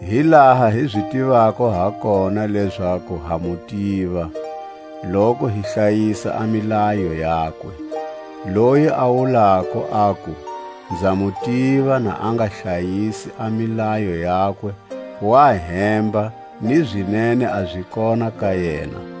Hi laha hi zi tivako ha kona lezaku ha mu tiva, loku hi hlayisa a milayo yakwe. Loyi a wulako aku: Nza mu tiva, na a nga hlayisi a milayo yakwe, wa hemba, ni zinene a zi kona ka yena.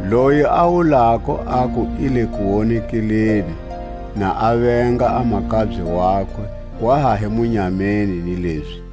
Loyi a wulako aku i le kuwonekeleni, na a venga a makabye wakwe, wa ha hi munyameni ni lezi.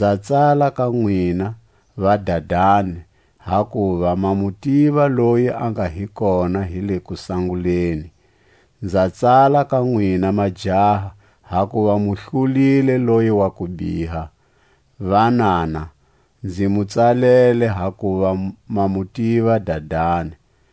Nza tsala ka nwina, vadadani, hakuva ma mu tiva loyi a nga hi kona hi le kusanguleni. Nza tsala ka nwina, majaha, hakuva mu hlulile loyi wa kubiha. Vanana, nzi mu tsalele, hakuva ma mu tiva Dadani.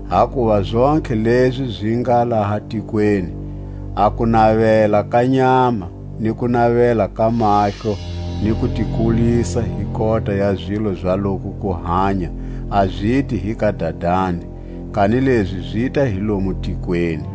Hakuva zontlhe lezi zi nga laha tikweni: a kunavela ka nyama, ni kunavela ka mahlo, ni kutikulisa hi kota ya zilo za loku kuhanya, a ziti hi ka Dadani, kanilezi zita hi lomu tikweni.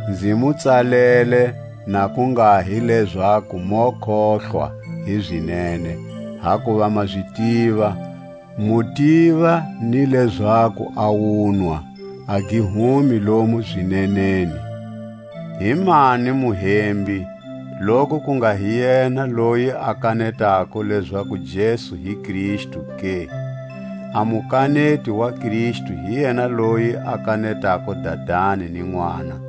Nzi mu tsalele, na ku nga hi lezaku mo kohlwa hi zinene, hakuva ma zi tiva, mu tiva ni lezaku a wunwa a gi humi lomu zineneni. Himani Muhembi, loku ku nga hi yena loyi a kanetako lezaku Jesu hi Kristu ke? A Mukaneti wa Kristu hi yena loyi a kanetako Dadani ni Nʼwana.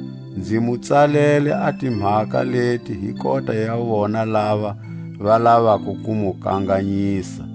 Nzi mu tsalele a timhaka leti hi kota ya vona lava va lavako ku mu kanganyisa.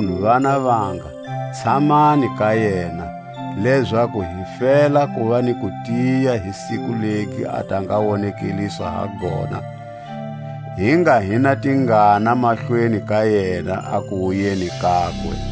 Makunu, vana vanga, tshamani ka yena; lezaku hi fela kuva ni kutiya hi siku legi a ta nga wonekeliswa ha gona, hi nga hi na tingana mahlweni ka yena a kuwuyeni kakwe.